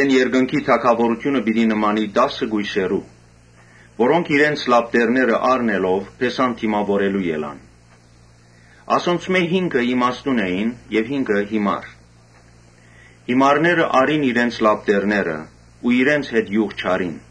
Երկնքի թագաւորութիւնը կը նմանի տասը կոյսերու, որոնք իրենց լապտերները առնելով՝ փեսան դիմաւորելու ելան։ Ասոնցմէ հինգը իմաստուն էին, իսկ հինգը՝ յիմար։ Յիմարները առին իրենց լապտերները, բայց իրենց հետ իւղ չառին.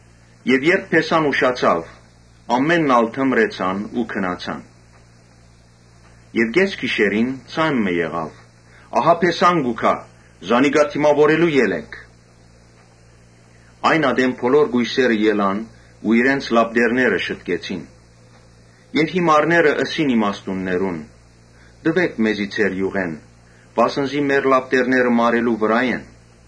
Երբ փեսան ուշացաւ, ամէնքն ալ թմրեցան ու քնացան։ Կէս գիշերին ձայն մը եղաւ. ‘Ահա փեսան կու գայ. զանիկա դիմաւորելու ելէք’։ Այն ատեն բոլոր կոյսերը ելան ու իրենց լապտերները շտկեցին։ Յիմարները ըսին իմաստուններուն. «Տուէք մեզի ձեր իւղէն, վասն զի մեր լապտերները մարելու վրայ են»։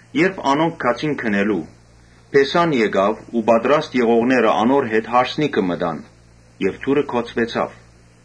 Երբ անոնք գացին գնելու, փեսան եկաւ ու պատրաստ եղողները անոր հետ հարսանիքը մտան եւ դուռը գոցուեցաւ։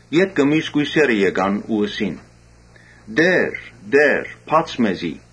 Ետքը միւս կոյսերը եկան ու ըսին. ‘Տէ՛ր, Տէ՛ր, բա՛ց մեզի’։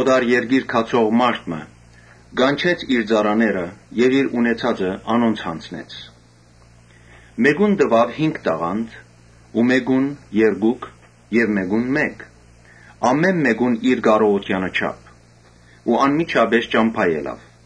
Օտար երկիր գացող մարդ մը կանչեց իր ծառաները եւ իր ունեցածը անոնց յանձնեց։ Մէկուն տուաւ հինգ տաղանդ ու մէկուն՝ երկուք եւ մէկուն՝ մէկ։ Ամէն մէկուն իր կարողութեանը չափ ու անմիջապէս ճամբայ ելաւ։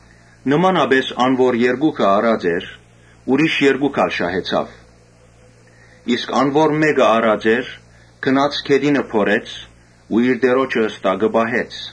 Նմանապէս ան՝ որ երկուք առած էր, ուրիշ երկուք ալ շահեցաւ։ Իսկ ան՝ որ մէկ առած էր, գնաց գետինը փորեց ու իր տիրոջը ստակը պահեց։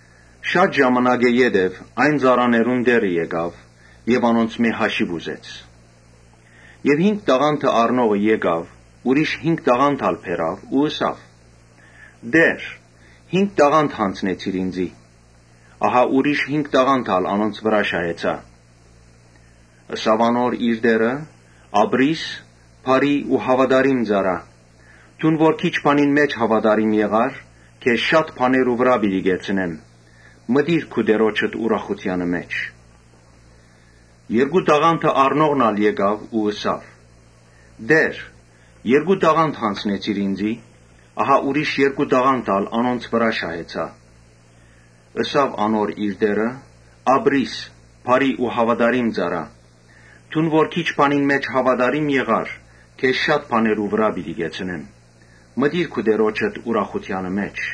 Շատ ժամանակ յետոյ այն ծառաներուն տէրը եկաւ եւ անոնցմէ հաշիւ ուզեց։ Հինգ տաղանդ առնողը եկաւ՝ ուրիշ հինգ տաղանդ ալ բերաւ ու ըսաւ. «Տէ՛ր, հինգ տաղանդ յանձնեցիր ինծի, ահա ուրիշ հինգ տաղանդ ալ անոնց վրայ շահեցայ»։ Տէրը ըսաւ անոր. «Ապրի՛ս, բարի ու հաւատարիմ ծառայ. դուն որ քիչ բանի մէջ հաւատարիմ եղար, քեզ շատ բաներու վրայ պիտի կեցնեմ. մտիր քու տիրոջդ ուրախութեանը մէջ»։ Երկու տաղանդ առնողն ալ եկաւ ու ըսաւ. «Տէ՛ր, երկու տաղանդ յանձնեցիր ինծի, ահա ուրիշ երկու տաղանդ ալ անոնց վրայ շահեցայ»։ Տէրը ըսաւ անոր. «Ապրի՛ս, բարի ու հաւատարիմ ծառայ, դուն որ քիչ բանի մէջ հաւատարիմ եղար, քեզ շատ բաներու վրայ պիտի կեցնեմ. մտիր քու տիրոջդ ուրախութեանը մէջ»։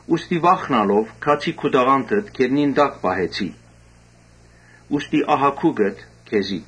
Ուստի վախնալով՝ գացի քու տաղանդդ գետնին տակ պահեցի. ուստի ահա քուկդ քեզի»։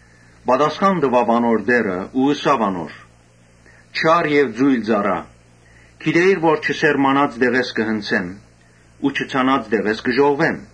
Պատասխան տուաւ անոր տէրը ու ըսաւ. «Չար եւ ծո՛յլ ծառայ, գիտէիր թէ չսերմանած տեղէս կը հնձեմ ու չցանած տեղէս կը ժողվեմ,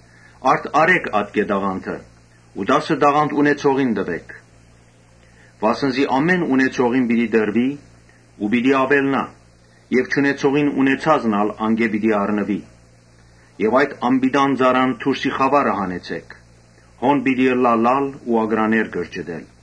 Արդ՝ առէ՛ք ատկէ տաղանդը ու տասը տաղանդ ունեցողին տուէք։ Վասն զի ամէն ունեցողին պիտի տրուի ու պիտի աւելնայ եւ չունեցողին ունեցածն ալ անկէ պիտի առնուի։ Իսկ այդ անպիտան ծառան դուրսի խաւարը հանեցէք. հոն պիտի ըլլայ լալ ու ակռաներ կրճտել»։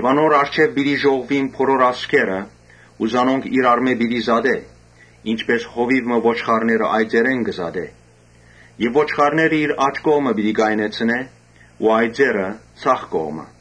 Անոր առջեւ պիտի ժողվուին բոլոր ազգերը ու զանոնք իրարմէ պիտի զատէ, ինչպէս հովիւ մը ոչխարները այծերէն կը զատէ։ Ոչխարները իր աջ կողմը պիտի կայնեցնէ ու այծերը՝ ձախ կողմը։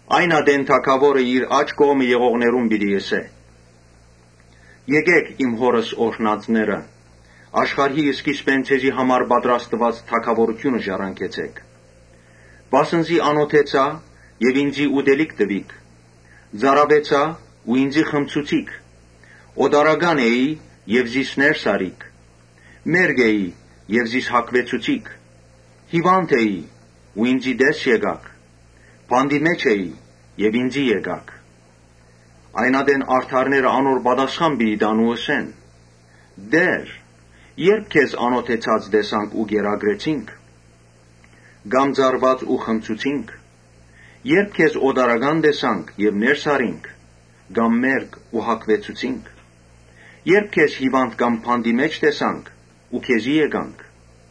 Այն ատեն թագաւորը իր աջ կողմը եղողներուն պիտի ըսէ. «Եկէք իմ Հօրս օրհնածները, աշխարհի սկիզբէն ձեզի համար պատրաստուած թագաւորութիւնը ժառանգեցէք. Վասն զի անօթեցայ եւ ինծի ուտելիք տուիք. ծարաւեցայ ու ինծի խմցուցիք. օտարական էի, զիս ներս առիք. Մերկ էի, զիս հագուեցուցիք. հիւանդ էի, ինծի տես եկաք. բանտի մէջ էի, ինծի եկաք»։ Այն ատեն արդարները անոր պատասխան պիտի տան ու ըսեն. «Տէ՜ր, ե՞րբ քեզ անօթեցած տեսանք ու կերակրեցինք, կամ ծարաւած՝ ու խմցուցինք. Ե՞րբ քեզ օտարական տեսանք եւ ներս առինք, կամ մերկ՝ ու հագուեցուցինք. Ե՞րբ քեզ հիւանդ կամ բանտի մէջ տեսանք ու քեզի եկանք»։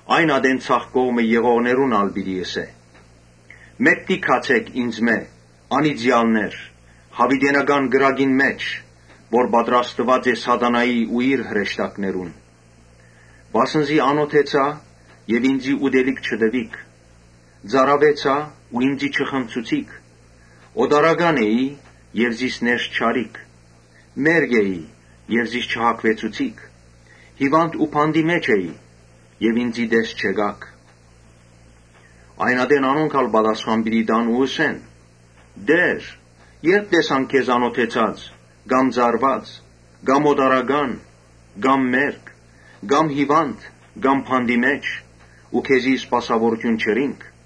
Այն ատեն ձախ կողմը եղողներուն ալ պիտի ըսէ. «Մէկդի գացէք ինծմէ, անի՛ծեալներ, յաւիտենական կրակին մէջ՝ որ պատրաստուած է Սատանային ու իր հրեշտակներուն։ Վասն զի անօթեցայ, ինծի ուտելիք չտուիք. ծարաւեցայ, ինծի չխմցուցիք. Օտարական էի, զիս ներս չառիք. մերկ էի, զիս չհագուեցուցիք. հիւանդ էի ու բանտի մէջ էի, ինծի տես չեկաք»։ Այն ատեն անոնք ալ պատասխան պիտի տան ու ըսեն. «Տէ՛ր, ե՞րբ տեսանք քեզ անօթեցած կամ ծարաւած կամ օտարական կամ մերկ կամ հիւանդ կամ բանտի մէջ ու քեզի սպասաւորութիւն չըրինք»։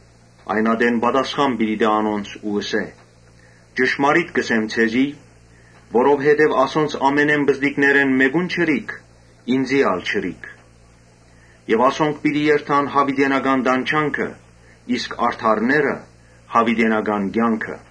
Այն ատեն պատասխան պիտի տայ անոնց ու ըսէ. «Ճշմարիտ կ’ըսեմ ձեզի. որովհետեւ ինչ որ ասոնցմէ ամենէն պզտիկներէն մէկուն չըրիք, ինծի ալ չըրիք»։ Ասոնք պիտի երթան յաւիտենական տանջանքը, իսկ արդարները՝ յաւիտենական կեանքը։